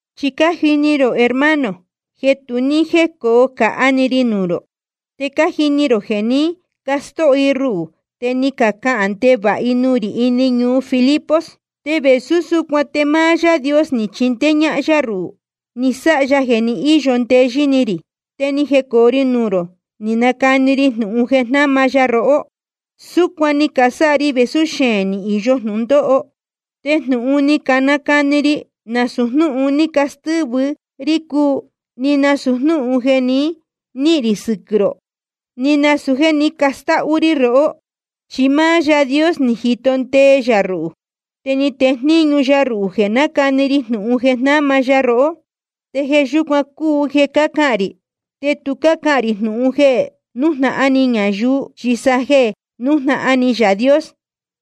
Chi cájini rō hermano, jeē tu ní jécoo cāhá‑ni ri nuū rō. Te cájini rō jeē ní castóho i ruhū te ni cacahān ndevāha i nuū rī ini ñuu Filipos. Te vēsú súcuan te máá Yaā Dios ni chindéé ñáhán yá ruhū, ni sáha ya jeē ni íyo ndeyɨ́ ni rī, te ni jecoo ri ñuu rō ni canacani ri jnūhun jeē jnáma ya rohó. Súcuan ni casáha ri vēsú xeēn ni īyo jnūndóho. Te jnūhun ni canacani ri, nasūu jnúhun ni castɨ́vɨ ri cúu, ni nasūu jéē nihín rī sɨquɨ̄ rō, ni nasūu jéē ní castáhú rí rohó. Chi máá Yaā Dios ni jito ndee yā ruhū, te ni tejníñu ya ruhū jeē nácani ri jnūhun jeē jnáma ya rohó. Te jeē yúcuan cúu jeē cácahān rī. Te tu cácahān rī jnūhun jeē nújnahan ni ñayuu, chi sa jeē nújnahan ni Yaā Dios,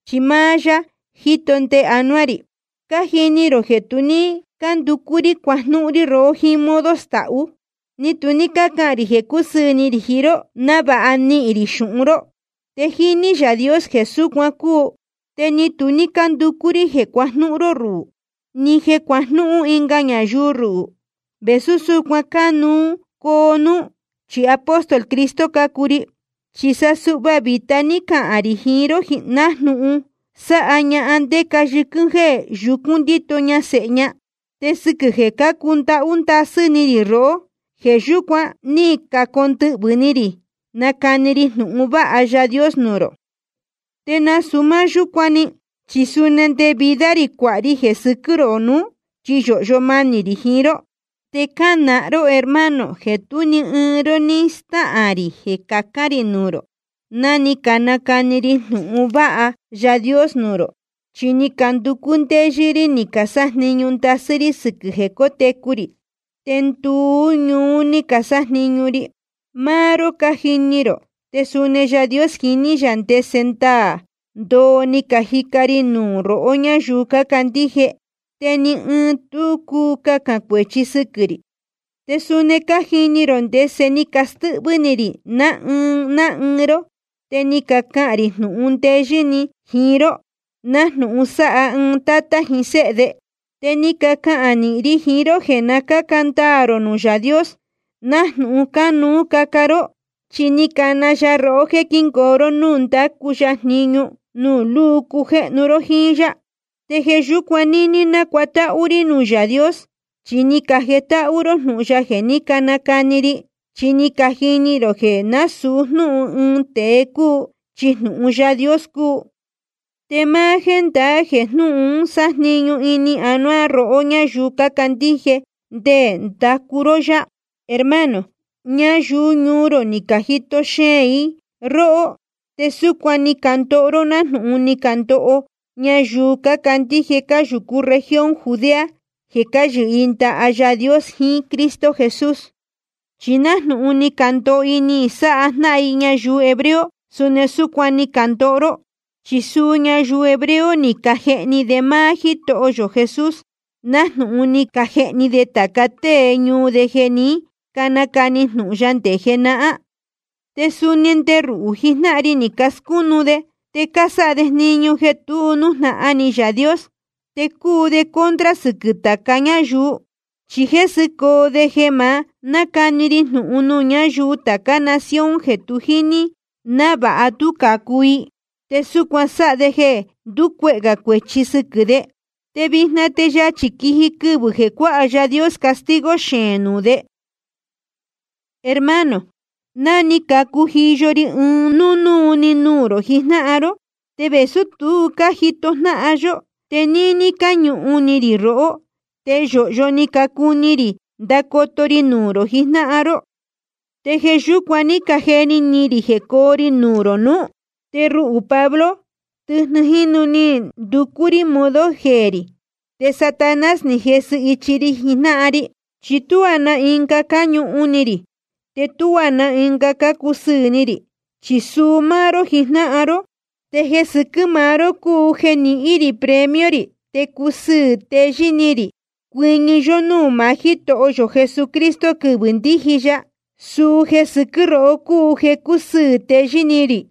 chi máá yá jíto ndee anuá rī. Te cájini rō jeē tu ní cánducú rí cuajnúhún rí rohó ɨɨn modo stahú, ni tu ní cácahān rī jeē cúsɨɨ̄ ni rī jiín ró návāha nihīn rī xūhun ró. Te jíní Yaā Dios jeē súcuan cúu. Te ni tu ní cánducú rí jeē cuajnúhún ró ruhū, ni jeē cuajnúhún ɨnga ñayuu ruhū, vēsú súcuan cánuú coo núú, chi apóstol Cristo cácuu ri. Chi sa suhva vīta ní cacahān rī jiín ró, nájnūhun sáha ñahan ndéca yɨquɨ́n jéē yucún ndíto ña sēhe ña. Te sɨquɨ̄ jeē cácundáhú ndasɨ́ ni rī rohó, jeē yúcuan ní cacondɨhvɨ̄ ni rī nacani ri jnūhun vāha Yaā Dios nuū rō. Te nasūu máá yúcuan‑ni, chi suni nde vida rī cuāha ri jeē sɨquɨ́ rō nuú, chi yōhyo manī rī jiín ró. Te cánahan ró hermano, jeē tú ni ɨɨn ró ní stáhān rī jeē cacān rī nuū rō ná ni canacani ri jnūhun vāha Yaā Dios nuū rō. Chi ni canducú ndéyɨ́ rí ni casájniñu ndasɨ́ rí sɨquɨ̄ jeē cótecu rī. Te nduú ñuú ni casájniñu ri. Máá ró cájini rō, te suni Yaā Dios jiní yā ndese ndaā ndoo ni cajica ri nuū rohó ñáyuu cácandíje. Te ni ɨɨn tu cúu cahān cuēchi sɨquɨ̄ rī. Te suni cájini rō ndese ni castɨ́hvɨ́ ni rī ná ɨɨn ná ɨɨn ró, te ni cacahān rī jnūhun ndeyɨ́ ni jiín ró, nájnūhun sáha ɨɨn tátá jiín séhe de. Te ni cacahān nīhin ri jiín ró jeē na cáca ndaā rō nuū Yaā Dios nájnūhun cánuú caca ró. Chi ni cana ya rohó jéē quíngoo ró núū ndácu ya jniñu, nuū luu cujéhnu ró jíín yá. Te jeē yúcuan níní nácuatáhú rí nuū Yaā Dios, chi ni cajetáhú ró jnūhun ya jeē ní canacani ri. Chi ni cajini rō jeē násūu jnúhun ɨɨn tēe cúu, chi jnūhun Yaā Dios cúu. Te máá jéndaá jeē jnúhun un sájniñu ini anuá rohó ñáyuu cácandíje nde ndacu ró yá. Hermano, ñayuu ñuu rō ni cajito xeēn i róhó, te súcuan ni candoho ró nájnūhun ni candoho ñayuu cácandíje cáyūcú región Judea jeē cáyɨhɨ ndaha Yaā Dios jiín Cristo Jesús. Chi nájnūhun ni candoho i ni sáha jnáhan i ñayuu hebreo, suni súcuan ni candoho ró. Chi suu ñayuu hebreo ni cajehni de máá Jítoho yō Jesús, nájnūhun ni cajehni de tāca tée ñuu de jeē ní canacani jnūhun ya nde jenahán. Te suni nde ruhū jijnáhan ri ni cascúnu de. Te cásáha de jniñu jeē tu nújnahan ni Yaā Dios, te cúu de contra sɨquɨ̄ tāca ñáyuu. Chi jésɨcoo de jeē ma nácani ri jnūhun nuū ñáyuu tācá nación jeē tu jíní, návāha tú cācu i. Te súcuan sáha de jeē nducuehē gā cuēchi sɨquɨ̄ de. Te vijna te yachī quiji quɨvɨ̄ jeē cuāha Yaā Dios castigo xeēn nuū de. Hermano, ni cacujiyo ri ɨɨn núnúu‑ni nuū rō jijnáhan ró. Te vēsú tu cájito jnáhan yó, te níní cáñuhun ni rī rohó. Te yōhyo ni cacuu ni rī ndacoto ri nuū rō jijnáhan ró. Te jeē yúcuan ní cajeni ni rī jecoo ri nuū rō nuú. Te ruhū Pablo, tɨjnɨ jínu ni nducú rí modo jeē rī, te Satanás ni jesɨ ichi ri jijnáhan ri. Chi tuá na ɨnga cáñuhun ni rī, te tuá na ɨnga cácusɨɨ̄ ni rī, chi suu máá ró jijnáhan ró. Te jeē sɨquɨ́ maá ró cúu jeē nihín rī premio rī te cusɨɨ̄ teyɨ́ ni rī cuɨñɨ yó núū maá Jítoho yō Jesucristo quɨvɨ̄ ndíji ya. Suu jeē sɨquɨ́ rohó cúu jeē cácusɨɨ̄ teyɨ́ ni rī.